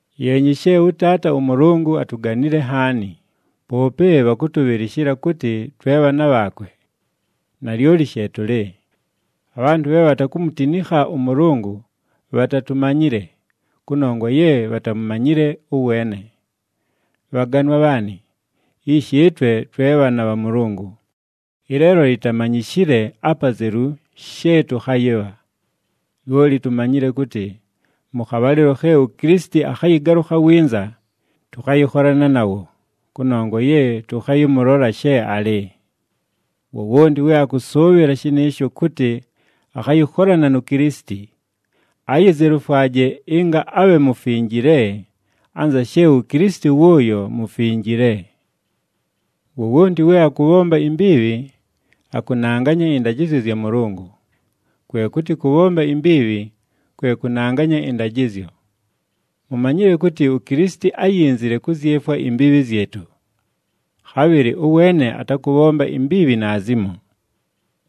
Yeenyi she ʉTaata ʉMʉlʉngʉ atuganile nhaani, poope bhakʉtʉbhɨlɨshɨla kʉtɨ twe bhaana bhaakwe! Nalyoli she tʉlɨ. Abhantʉ bhe bhatakumutinikha ʉMʉlʉngʉ bhatatumanyile, kʉnongwa ye bhatamumanyile ʉweene. Bhaganwa bhaanɨ, ishi ɨtwe twe bhaana bha Mʉlʉngʉ, ɨleelo yitamanyishile apazelu she tʉkhayɨbha. Lyoli tumanyile kʉtɨ mʉ khabhalɨlo khe uKilisiti akhayɨgalʉkha winza, tʉkhayɨkholana nawo, kʉnongwa ye tʉkhayɨmʉlola she alɨ. Wowonti we akʉsʉʉbhɨla shɨnɨɨsho kʉtɨ akhayɨkholana nu Kilisiti, ayizelufwaje ɨnga abhe mufinjile, anza she uKilisiti wʉʉyo mufinjile. Wowonti we akʉbhomba imbiibhi, akʉnanganya ɨndajɨzyo zya Mʉlʉngʉ, kwe kʉtɨ kʉbhomba imbiibhi, kwe kʉnanganya ɨndajɨzyo. Mumanyile kʉtɨ uKilisiti áyinzile kʉzyefwa imbiibhi zyɨtʉ. Khabhɨlɨ ʉweene atakʉbhomba imbiibhi naazimo.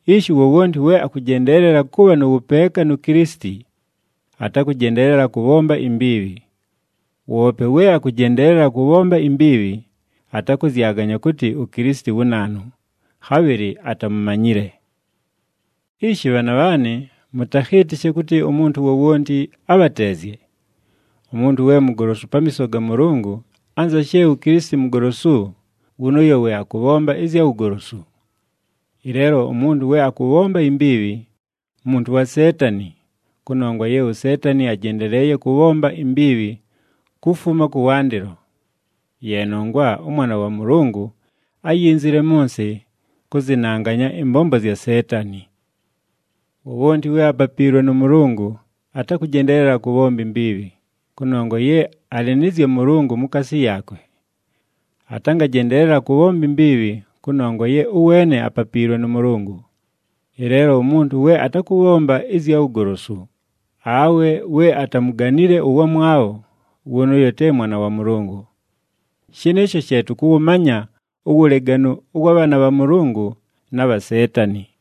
Ishi wowonti we akʉjendeelela kʉbha nʉ wʉpeeka nu Kilisiti, atakʉjendeelela kʉbhomba imbiibhi. Woope we akʉjendeelela kʉbhomba imbiibhi, atakʉzyaganya kʉtɨ uKilisiti wu naanu, khabhɨlɨ atamumanyile. Ishi bhaana bhaanɨ, mʉtakhɨɨtɨshe kʉtɨ umuntu wowonti abhateezye. Umuntu we mugolosu pamiiso ga Mʉlʉngʉ, anza she uKilisiti mugolosu, wʉnʉʉyo we akʉbhomba ɨzya wugolosu. Ɨleelo umuntu we akʉbhomba imbiibhi, muntu wa Seetani, kʉnongwa ye uSeetani ajendeleeye kʉbhomba imbiibhi kufuma kʉwandɨlo. Ye nongwa ʉMwana wa Mʉlʉngʉ áyinzile mʉ nsɨ, kʉzɨnanganya ɨmbombo zya Seetani. Wowonti we apapiilwe nʉ Mʉlʉngʉ, atakʉjendeelela kʉbhomba imbiibhi, kʉnongwa ye alɨ nɨ zya Mʉlʉngʉ mukaasi yaakwe. Atangajendeelela kʉbhomba imbiibhi kʉnongwa ye ʉweene apapiilwe nʉ Mʉlʉngʉ. Ɨleelo umuntu we atakʉbhomba ɨzya wugolosu, awe we atamuganile ʉwamwabho, wʉnʉʉyo te mwana wa Mʉlʉngʉ. Shɨnɨɨsho she tʉkʉwʉmanya uwuleganu ʉwa bhaana bha Mʉlʉngʉ, na bha Seetani.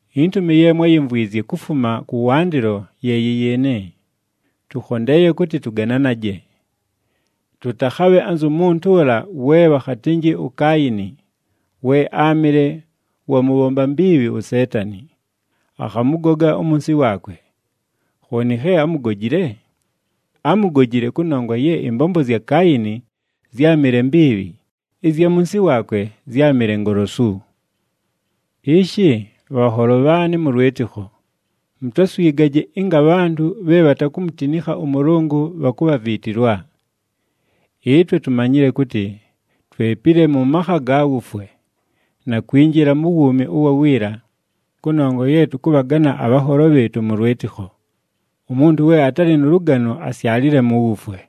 Intumi ye mwáyimvwizye kufuma kʉwandɨlo ye yɨ yɨɨnɨ: tʉkhondeeye kʉtɨ tʉgananaje. Tʉtakhabhe anzu muntu ʉla we bhakhatɨnjɨ uKaayini, we áamɨle wa mʉbhomba mbiibhi uSeetani, akhamʉgoga umunsi waakwe. Khooni khe ámugojile? Ámugojile kʉnongwa ye ɨmbombo zya Kaayini zyámɨle mbiibhi, ɨzya munsi waakwe zyámɨle ngolosu. Ishi, bhanholo bhaanɨ mʉ lwɨtɨkho, mutaswigaje ɨnga abhantʉ bhe bhatakumutinikha ʉMʉlʉngʉ bhakubhaviitilwa. Ɨtwe tumanyile kʉtɨ twepile mʉ makha ga wufwe, na kwinjila mu wuumi ʉwa wiila, kʉnongwa ye tʉkʉbhagana abhanholo bhɨɨtʉ mʉ lwɨtɨkho. Umuntu we atalɨ nʉ lʉgano asyalile mu wufwe.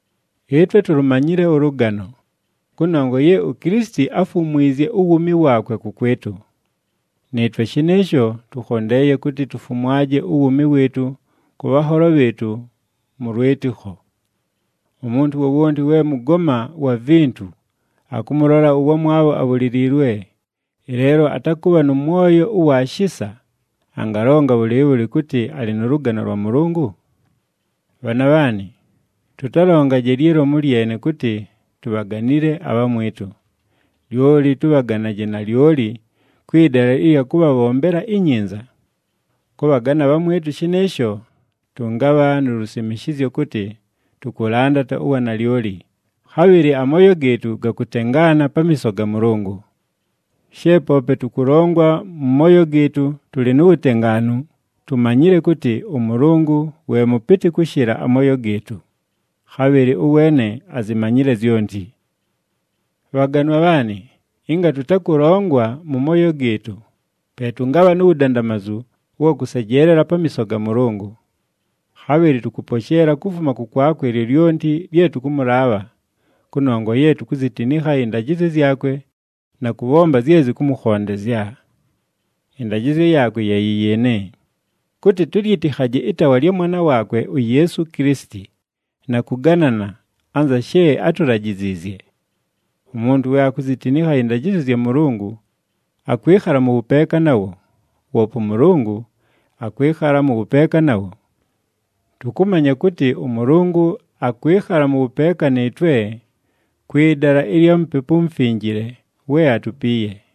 Ɨtwe tulumanyile ʉlʉgano, kʉnongwa ye uKilisiti áfumwizye uwuumi waakwe kʉkwɨtʉ. Nɨɨtwe shɨnɨɨsho, tʉkhondeeye kʉtɨ tufumwaje uwuumi wɨɨtʉ kʉ bhanholo bhɨɨtʉ mʉ lwɨtɨkho. Umuntu wowonti we mʉgoma wa vintu akʉmʉlola ʉwamwabho abhuliliilwe, ɨleelo atakʉbha nʉ mwoyo ʉwa shisa, angalonga bhʉlɨɨbhʉlɨ kʉtɨ alɨ nʉ lʉgano lwa Mʉlʉngʉ? Bhaana bhaanɨ, tʉtalongaje lyi lomu lyene kʉtɨ tubhaganile abhamwɨtʉ, lyoli tʉbhaganaje nalyoli kwɨ dala ɨlya kʉbhabhombela inyinza. Kʉbhagana abhamwɨtʉ shɨnɨɨsho, tʉngabha nu lusimishizyo kʉtɨ tʉkʉlandata uwanalyoli, khabhɨlɨ amooyo gɨɨtʉ gakʉtengaana pamiiso ga Mʉlʉngʉ. She poope tʉkʉlongwa mʉ mooyo gɨɨtʉ tʉlɨ nu wutengaanu, tumanyile kʉtɨ ʉMʉlʉngʉ we mʉpɨtɨ kʉshɨla amooyo gɨɨtʉ, khabhɨlɨ ʉweene azimanyile zyonti. Bhaganwa bhaanɨ, ɨnga tʉtakʉlongwa mʉ mooyo gɨɨtʉ, pe tʉngabha nu wudandamazu ʉwa kʉsejeelela pamiiso ga Mʉlʉngʉ. Khabhɨlɨ tʉkʉposheela kufuma kʉkwakwe lyolyonti lye tʉkʉmʉlaabha, kʉnongwa ye tukuzitinikha ɨndajɨzyo zyakwe na kʉbhomba zye zɨkʉmʉkhondezya. Ɨndajɨzyo yaakwe ye yɨ yɨɨnɨ, kʉtɨ tʉlyɨtɨkhaje ɨtaawa lya Mwana waakwe uYeesu Kilisiti, na kʉganana, anza she átulajiziizye. Umuntu we akuzitinikha ɨndajɨzyo zya Mʉlʉngʉ, akwɨkhala mʉ wʉpeeka nawo, woope ʉMʉlʉngʉ akwɨkhala mʉ wʉpeeka nawo. Tʉkʉmanya kʉtɨ ʉMʉlʉngʉ akwɨkhala mʉ wʉpeeka nɨɨtwe kwɨ dala ɨlya Mupepu uMufinjile we atupiiye.